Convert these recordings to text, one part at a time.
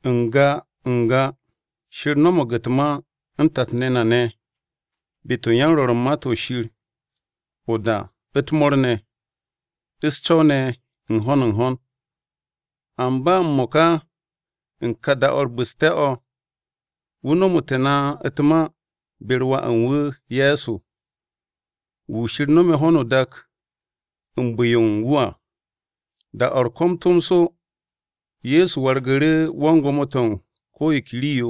N-ga N-ga, Shir no̱mo̱g u̱t-ma u̱n tat-ne̱ na ne̱ be-to̱ u̱n yan-Rwo̱r u̱n Ma-to̱ Shir o-da u̱t-mo̱o̱r ne̱, u̱s-co̱w ne̱ u̱n ho̱n u̱n ho̱n. Amba m-mo̱ka u̱n kà da-o̱ u̱r-bu̱ste̱ o̱, wu̱ nomu̱tu̱ na u̱t-ma be-u̱r Wà u̱n wu̱ Ye̱so, wu̱ Shir no̱me̱ ho̱no o-dak u̱n bu̱-yo u̱n wu̱ à, da-o̱ u̱r-ko̱m tomso Ye̱so wargu̱ru̱ wan-gwo̱mo-to̱ u̱n ko̱ yo ke rii-yo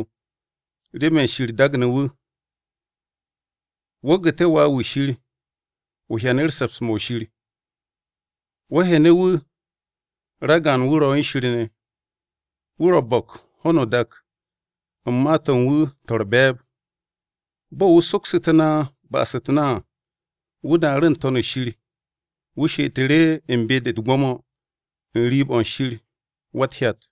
remen Shir daagne̱ wu̱. Wo̱ gu̱te̱ Wà-wu̱ Shir, o hyanu̱ru̱ se̱ps-mo̱ Shir. Wo̱ hyene̱ wu̱, ragaan-wu̱ ro̱ u̱n Shir ne̱. Wu̱ ro̱ bo̱k ho̱no o-dak u̱n ma-to̱ u̱n wu̱ to̱ u̱r-be̱e̱b. Bo̱ wu̱ soksu̱tu̱ na ba'as-u̱t na à, wu̱ daaru̱ n-To̱n u̱n shir, wu̱ she'etu̱ru̱ u̱n be-de u̱t-gwo̱mo n-riib o̱ u̱n Shir Wa-u̱t-Hyat.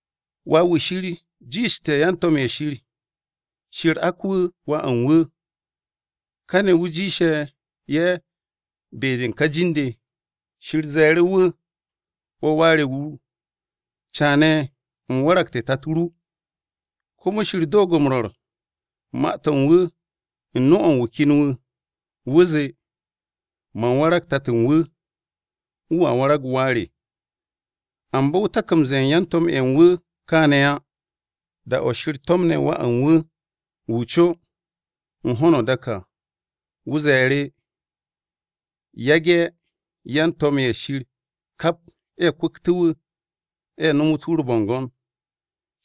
Wà-wu̱ Shir jiishte̱ yan-to̱m-ye̱ Shir. Shir ak wu̱ Wà u̱n wu̱. Kane̱ wu̱ jiishe̱ ye̱ be-de u̱n ka jin-de. Shir ze̱e̱ru̱ wu̱, “Wo̱ Wà re wu̱, Caane̱ u̱m waragte̱ Tato ru.” Komo Shir doog m-rwo̱r u̱n ma-to̱ u̱n wu̱ u̱n nu-o̱ u̱n wu̱ ken wu̱, wu̱ zee, “Man warag Tato u̱n wu̱, Wu̱a warag Wà re.” Amba wu̱ tak m-ze̱e̱ u̱n yan-to̱m-ye̱ u̱n wu̱ kaane̱ á. Da-o̱ Shir to̱mne̱ Wà u̱n wu̱, wu̱ co, u̱n ho̱no o-dak à, wu̱ ze̱e̱ru̱, “Yage̱ yan-to̱m-ye̱ Shir kap ye̱ kwu̱ktu̱tu̱ wu̱, ye̱ nomote̱ wu̱ u̱r-bo̱ngo̱n.”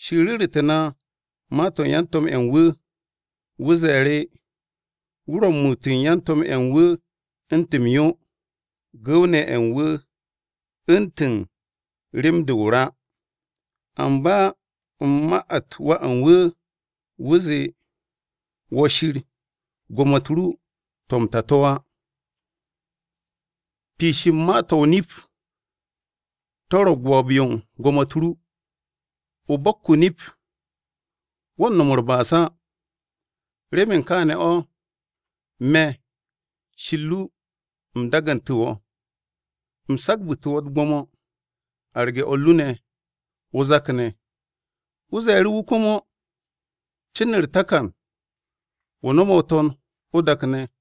Shir ru̱ru̱tu̱ na ma-to̱ u̱n yan-to̱m-ye̱ u̱n wu̱. Wu̱ ze̱e̱ru̱, “Wu̱ ro̱ m-muut u̱n yan-to̱m-ye̱ u̱n wu̱ u̱ntu̱n m-yo, Gu̱w-ne̱ ye̱ u̱n wu̱ u̱ntu̱n rem-de o-ra.” Amba u̱n ma-u̱t Wà u̱n wu̱, wu̱ zee, “Wo̱ Shir, gwo̱mo-u̱t ru to̱ m-ta to̱ á. Piish u̱n ma-to̱ o-nip, to̱ ro̱ gwo̱o̱b-yo u̱n gwo̱mo-u̱t ru. O bo̱k o-nip. Wo̱ u̱n no̱m u̱r-ba'as á. Remen kaane̱ o̱, me̱, Shir ru, u̱m dagantu̱ wo̱, U̱m sagabu̱tu̱ wo̱ u̱t-gwo̱mo arge̱ o̱r ru ne̱ o-zak ne̱.” Wu̱ ze̱e̱ru̱ wu̱ komo, “Wan-Ko̱yan o̱, cin u̱r-takan, wo̱ no̱me̱ o-to̱n o-dak ne̱.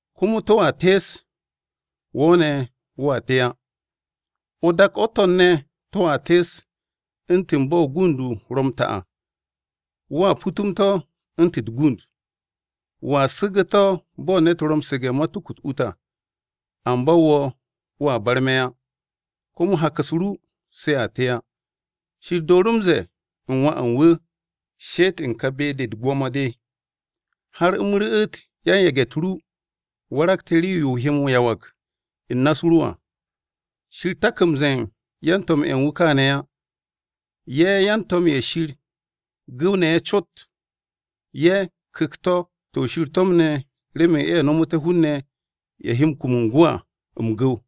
Komo to̱a tees. Wo̱ ne̱, wo̱a te á. O-dak o-to̱n ne̱ to̱a tees u̱ntu̱n bo̱ o-gund ro̱ m-ta à. Wo̱a putum to̱ u̱ntu̱n u̱t-gund, Wo̱a su̱gu̱ to̱ bo̱ ne̱t ro̱ m-su̱ge̱ matuku-u̱t ut à. Amba wo̱, wo̱a barme̱ á. Komo hak-u̱s ru se a te á.” Shir dooru̱ m-ze̱e̱ u̱n Wà u̱n wu̱, “She'et u̱n ka be-de u̱t-gwo̱mo de, har u̱m ru̱'u̱t yan-yage̱-u̱t ru waragte̱ rii-yo o he m-yawag u̱n na-u̱s ru à.” Shir tak m-ze̱e̱ yan-to̱m-ye̱ u̱n wu̱ kaane̱ á. Ye̱ yan-to̱m-ye̱ Shir gu̱w-ne̱ ye̱ cot. Ye̱ ku̱kt-to̱ to̱ Shir to̱mne̱ remen ye̱ no̱mu̱té̱ hun-ne̱ ye̱ he kum u̱n gwu̱ à, m-gu̱w.